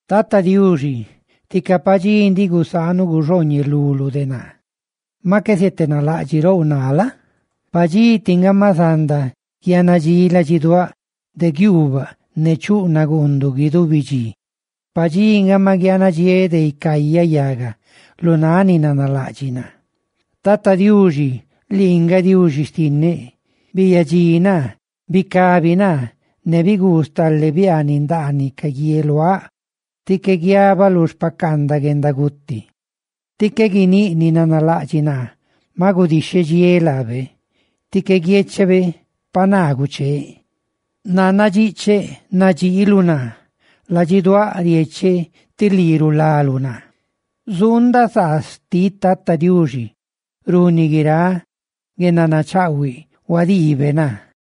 Tata Diuxi, tica padxí ndiꞌ gusaanuꞌ guxooñeluluꞌ de naa, maꞌ qué zietenalaꞌdxiꞌrouꞌ naa la? Pa dxi tiꞌ nga maꞌ zanda guianadxi ladxiduáꞌ de guiuubaꞌ ne chuꞌ naguunduꞌ guidubi dxi. Pa dxi nga ma guianadxiéꞌ de icayaꞌ yaga lu náꞌ ni nanalaꞌdxiꞌ naa. Tata Diuxi, lii nga Diuxi xtinneꞌ, ¡biyadxi naa, bicabi naa, ne biguu stale biaaniꞌ ndaaniꞌ ca guieluáꞌ! ¡Tí qué guiabaꞌ lu xpacaandaꞌ guendaguti! Tí qué guiníꞌ ni nanalaꞌdxiꞌ naa: «¡Ma gudixhedxiéꞌ laabe!» ¡Tí qué guiechebe pa naa gucheeꞌ! Nannadxiꞌcheꞌ nadxiiluꞌ naa; ladxiduáꞌ riecheꞌ tí lii rulaluꞌ naa. ¡Zuundaꞌ saa xtiꞌ Tata Diuxi runi guiráꞌ guendanachaꞌhuiꞌ huadiibe naa!